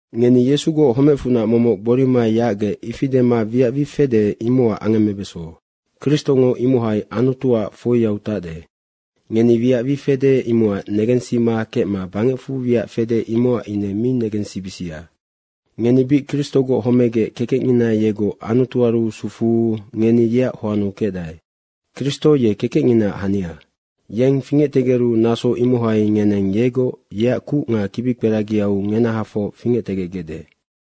Ngeni Yesugoc homecfunac momoc gborima yacgec, ifi dema wiac wi fede, imocac angemmebeso. Kristongo imohai Anutuac foiau tacde. Ngeni wiac wi fede, imocac negensima kecma bangecfu wiac fede, imocac ine mi negensibisia. Ngeni bic Kristogoc homegec kekecngina yegoc Anutuaru sufuu, ngeni yeac hoannu kecdae. Kristo ye kekecnginaac hania. Yeng fingectegeru, naso imohai ngeneng yegoc yeac kuc nga kibikperagiau ngenahafoc fingectegecgecde.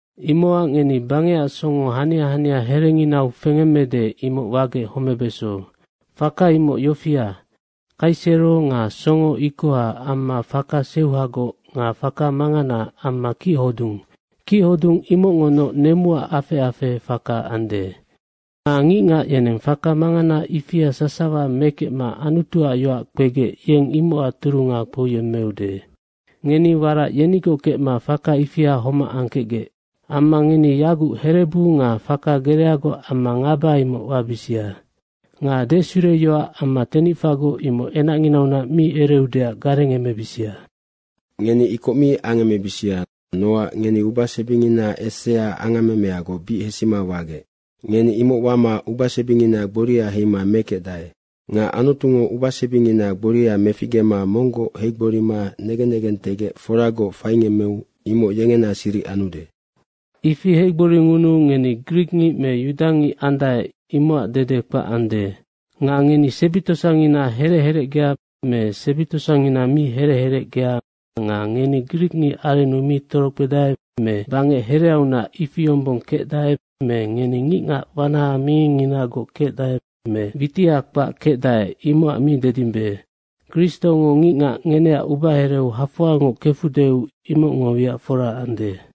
Imocac ngeni bangecac songo hania hania herenginau fengemmede, imoc wagec homebeso. Faka imoc yofia, kaisero nga songo ikoha amma faka seuhagoc nga faka mangana amma kichodung. Kichodung imocngonoc nemuac afec afehe faka ande. Nga ngicngac yeneng faka mangana ifia sasawa mekecma Anutuac yoac kpegec yeng imocac turunga kpouyemmeude. Ngeni warac yenigoc kecma faka ifia homac angkecgec. Amma ngeni yaguc herebu nga faka gereagoc amma ngaba imoc wabisia. Nga desureyoac amma tenicfagoc imoc enacnginaunac mi ereudeac garengemebisia. Ngeni ikoc mi angemebisia nocac ngeni ubasebingina esea angammemeagoc bic hesima wagec. Ngeni imoc wama ubasebingina gboria heima mekecdae. Nga Anutungo ubasebingina gboria meficgema monggoc heigborima negen negentegec foragoc faingemmeu imoc yengena siric anude. Ifi heigboringunuu ngeni grikngic me yudangic andae, imocac dede kpac ande. Nga ngeni sebi tosangina herec herecgea me sebi tosangina mi herec herecgea nga ngeni grikngic arennu mi torokpedae me bangec hereaunac ifi yombong kecdae me ngeni ngicngac wanaha mingingnginagoc kecdae me witiha kpac kecdae, imocac mi dedimbe, Kristongo ngicngac ngeneac ubahereu hafoangoc kefudeu, imocngo wiac fora ande.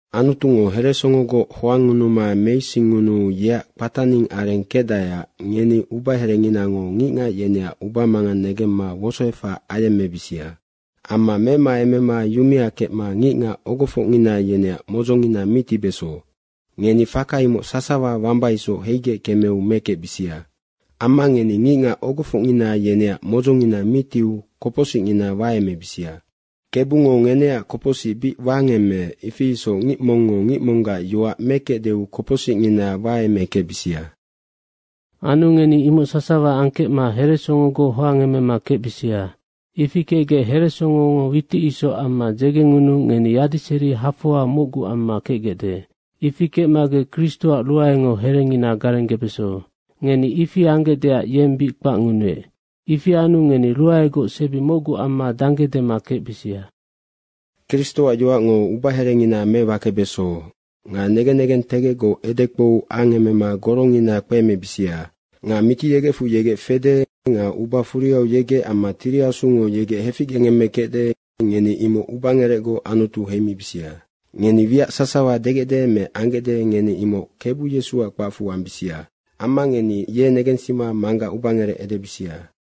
Anutungo heresongogoc hoangngunuma meisingngunuu yeac kpataning areng kecdaeac ngeni ubaherenginango ngicngac yeneac ubamangang negemma wosoefac ayemmebisia. Amma memaemema yumea kecma ngicngac ogofocngina yeneac modzongina mi tibeso. Ngeni faka imoc sasawa wamba isoc heigec kemeu mekecbisia. Amma ngeni ngicngac ogofocngina yeneac modzongina mi tiu kopocsicngina waemebisia. Kebungo ngeneac kopocsic bic wangemmeec, ifi isoc ngic mongngo ngic monggac yoac mekecdeu kopocsicngina waemekecbisia. Anu ngeni imoc sasawa angkecma heresongogoc hoangemema kecbisia. Ifi kecgec heresongongo witic isoc amma dzegengunuu ngeni yadiseri hafoa mocgu amma kecgecde. Ifi kecmagec Kristoac ruaengo herengina garenggebeso. Ngeni ifi anggecdeac yeng bic kpacngunuec. Ifi anu ngeni ruaegoc sebi mocgu amma dangge dema kecbisia. Kristoac yoacngo ubaherengina mewakebeso. Nga negen negentegecgoc edekpou angemema gorongina kpeemebisia. Nga Mitiyegecfu yegec fede nga uba furiau yegec amma Tiri Asungo yegec heficgengemme kecde, ngeni imoc ubangerecgoc Anutu heimibisia. Ngeni wiac sasawa degecde me anggecde, ngeni imoc Kebu Yesuac kpacfu ambisia. Amma ngeni ye negensima Manggac ubangerec edebisia.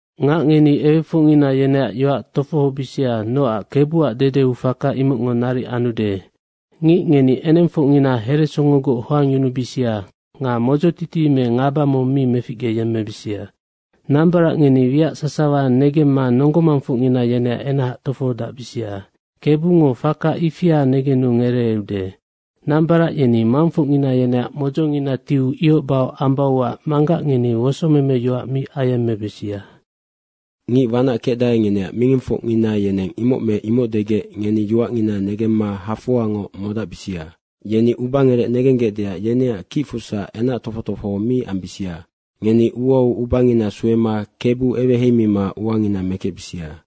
Ngac, ngeni ewefocngina yeneac yoac tofohobisia, nocac Kebuac dedeu faka imocngo naric anude. Ngic, ngeni enengfocngina heresongogoc hoangyunubisia nga modzotiti me ngaba mong mi meficgeyemmebisia. Nambarac, ngeni wiac sasawa negemma nonggo mangfocngina yeneac enac tofohodacbisia. Kebungo faka ifia negenu ngereeude. Nambarac yeni mangfocngina yeneac modzongina tiu ihoc bahoc ambauac manggac ngeni wosomeme yoac mi ayemmebisia. Ngic wanac kecdae, ngeneac mingingfocngina yeneng imoc me imoc degec ngeni yoacngina negemma hafoangoc modacbisia. Yeni ubangerec negenggecdeac yeneac kicfusac enac tofoc tofoho mi ambisia. Ngeni uau ubangina suema Kebu eweheimima uangina mekecbisia.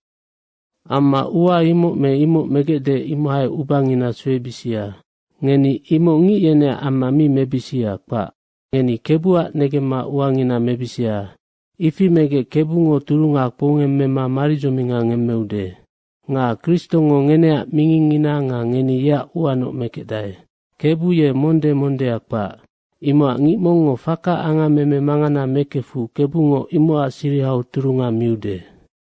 Amma ua imoc me imoc megecde, imohai ubangina suebisia. Ngeni imoc ngic yeneac amma mi mebisia, kpac. Ngeni Kebuac negemma uangina mebisia. Ifi megec Kebungo turunga kpoungemmema maridzominga ngemmeude. Nga Kristongo ngeneac mingingngina nga ngeni yeac uanoc mekecdae. Kebu ye monde mondea kpac. Imocac ngic mongngo faka angammeme mangana mekefu Kebungo imocac sirihau turunga miude.